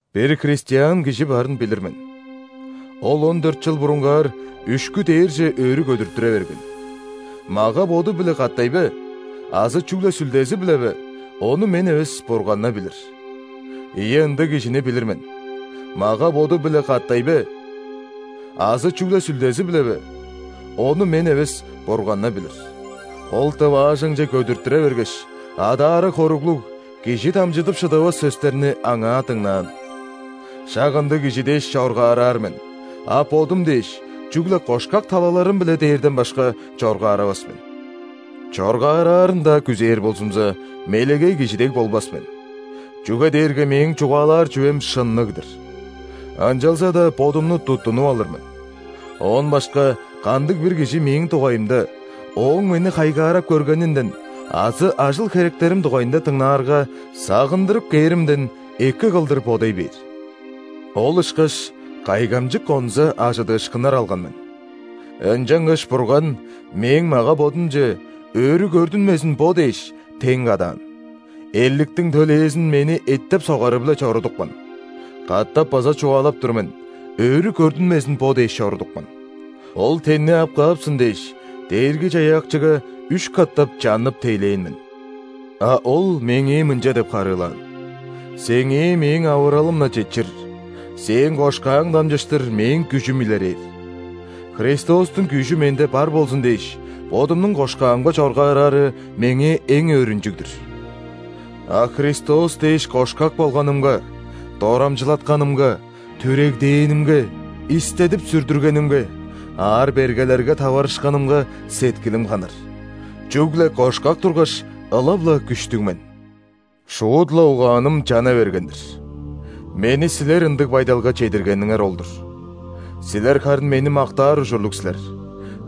Бир христиан кижи барын билир мен: ол он дөрт чыл бурунгаар үшкү дээрже өрү көдүртүре берген (мага-боду-биле катай бе азы чүгле сүлдези-биле бе, ону мен эвес, Бурган-на билир). Ийе, ындыг кижини билир мен. Мага-боду-биле катай бе азы чүгле сүлдези-биле бе (ону мен эвес, Бурган-на билир), ол дываажаңче көдүртүре бергеш, адаары хоруглуг, кижи дамчыдып шыдавас сөстерни аңаа дыңнаан. Шак ындыг кижи дээш, чоргаараар мен, а бодум дээш, чүгле кошкак талаларым-биле дээрден башка, чоргааравас мен. Чоргаараарын-даа күзээр болзумза, мелегей кижи дег болбас мен, чүге дээрге мээң чугаалаар чүвем шынныг-дыр. Ынчалза-даа бодумну туттунуп алыр мен, оон башка кандыг-бир кижи мээң дугайымда, ооң мени хайгаарап көргенинден азы ажыл-херектерим дугайында дыңнаарга, сагындырып кээримден, эки кылдыр бодай бээр. Ол ышкаш кайгамчык онза ·ажыдыышкыннар алган мен! Ынчангаш Бурган мээң мага-бодумче, өрү көрдүнмезин бо дээш, тен кадаан – эрликтиң төлээзин мени эттеп-согары-биле чорудупкан. Катап база чугаалап тур мен: өрү көрдүнмезин бо дээш чорудупкан. Ол тенни ап каапсын дээш, Дээрги-Чаяакчыга үш катап чаннып тейлээн мен. А Ол меңээ мынча деп харыылаан: «Сеңээ Мээң авыралым-на четчир. Сээң кошкааң дамчыштыр Мээң күжүм илерээр». Христостуң күжү менде бар болзун дээш, бодумнуң кошкаамга чоргаараары – меңээ эң өөрүнчүг-дүр! А Христос дээш кошкак болганымга, дорамчылатканымга, түрегдээнимге, истедип-сүрдүргенимге, аар-бергелерге таварышканымга сеткилим ханар. Чүгле кошкак тургаш, ылап-ла күштүг мен! Шуут-ла угааным чана берген-дир! Мени силер ындыг байдалга чедиргениңер ол-дур. Силер харын мени мактаар ужурлуг силер.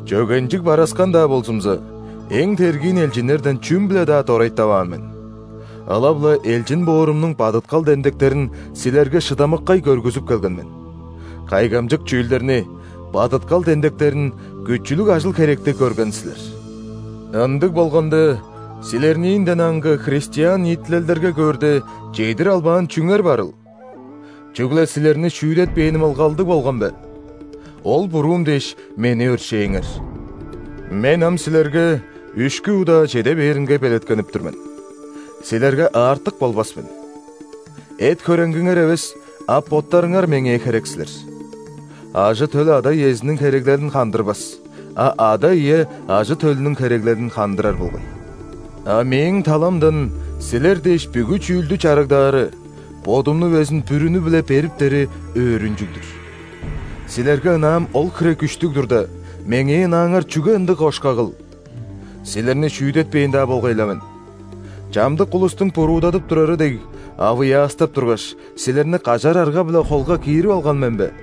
Чөгенчиг бараскан-даа болзумза, эң тергиин элчиннерден чүм-биле-даа дорайтаваан мен! Ылап-ла элчин боорумнуң бадыткал демдектерин силерге шыдамыккай көргүзүп келген мен. Кайгамчык чүүлдерни, бадыткал демдектерин, күчүлүг ажыл-херекти көрген силер. Ындыг болганда, силерниинден аңгы христиан ниитилелдерге көөрде, чедир албаан чүңер барыл? Чүгле силерни шүүдетпээним ылгалдыг болган бе? Ол буруум дээш, мени өршээңер! Мен ам силерге үшкү удаа чеде бээринге белеткенип тур мен. Силерге аартык болбас мен. Эт-хөреңгиңер эвес, а боттарыңар меңээ херек силер! Ажы-төл ада-иезиниң хереглелин хандырбас, а ада-ие ажы-төлүнүң хереглелин хандырар болгай. А мээң таламдан силер дээш бүгү чүүлдү чарыгдаары, бодумну безин бүрүнү-биле бериптери өөрүнчүг-дүр! Силерге ынаам ол хире күштүг турда, меңээ ынааңар чүге ындыг кошкагыл? Силерни шүүдетпээн-даа болгай-ла мен. Чамдык улустуң буруудадып турары дег, авыяастап тургаш, силерни кажар арга-биле холга киирип алган мен бе?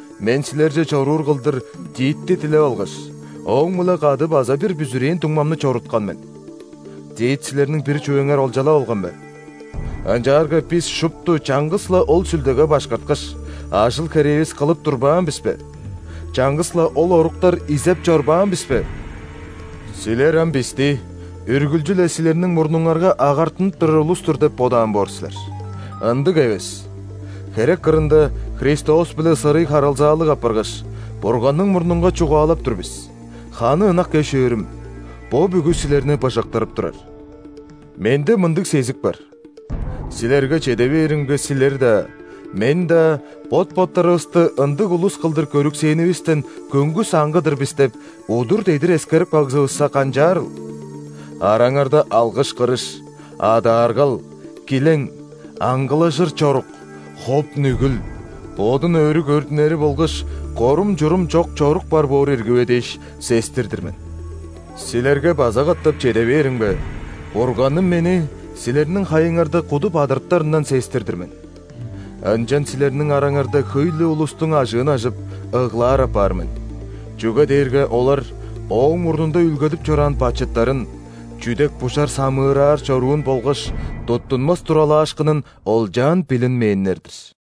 Мен силерже чоруур кылдыр Титти дилеп алгаш, ооң-биле кады база бир бүзүрээн дуңмамны чоруткан мен. Тит силерниң бир чүвеңер олчалап алган бе? Ынчаарга бис шупту чаңгыс-ла ол Сүлдеге башкарткаш, ажыл-херээвис кылып турбаан бис бе, чаңгыс-ла ол оруктар изеп чорбаан бис бе?! Силер ам бисти үргүлчү-ле силерниң мурнуңарга агартынып турар улус-тур деп бодаан боор силер. Ындыг эвес! Херек кырында Христос-биле сырый харылзаалыг апаргаш, Бурганның мурнунга чугаалап тур бис: ханы ынак эш-өөрүм, бо бүгү силерни быжыктырып турар! Менде мындыг сезик бар: силерге чеде бээримге, силер-даа, мен-даа, бот-боттарывысты ындыг улус кылдыр көрүксээнивистен көңгүс аңгы-дыр бис деп, удур-дедир эскерип кагзывысса, канчаарыл? Араңарда алгыш-кырыш, адааргал, килең, аңгылажыр чорук, хоп-нүгүл, бодун өрү көрдүнери болгаш корум-чурум чок чорук бар боор ирги бе дээш, сестир-дир мен. Силерге база катап чеде бээримге, Бурганым мени силерниң хайыңарда куду бадырыптарындан сестир-дир мен. Ынчан силерниң араңарда хөй-ле улустуң ажыын ажып, ыглаар апаар мен, чүге дээрге олар ооң мурнунда үүлгедип чораан бачыттарын: чүдек-бужар самыыраар чоруун болгаш туттунмас туралаашкынын олчаан билинмээннер-дир.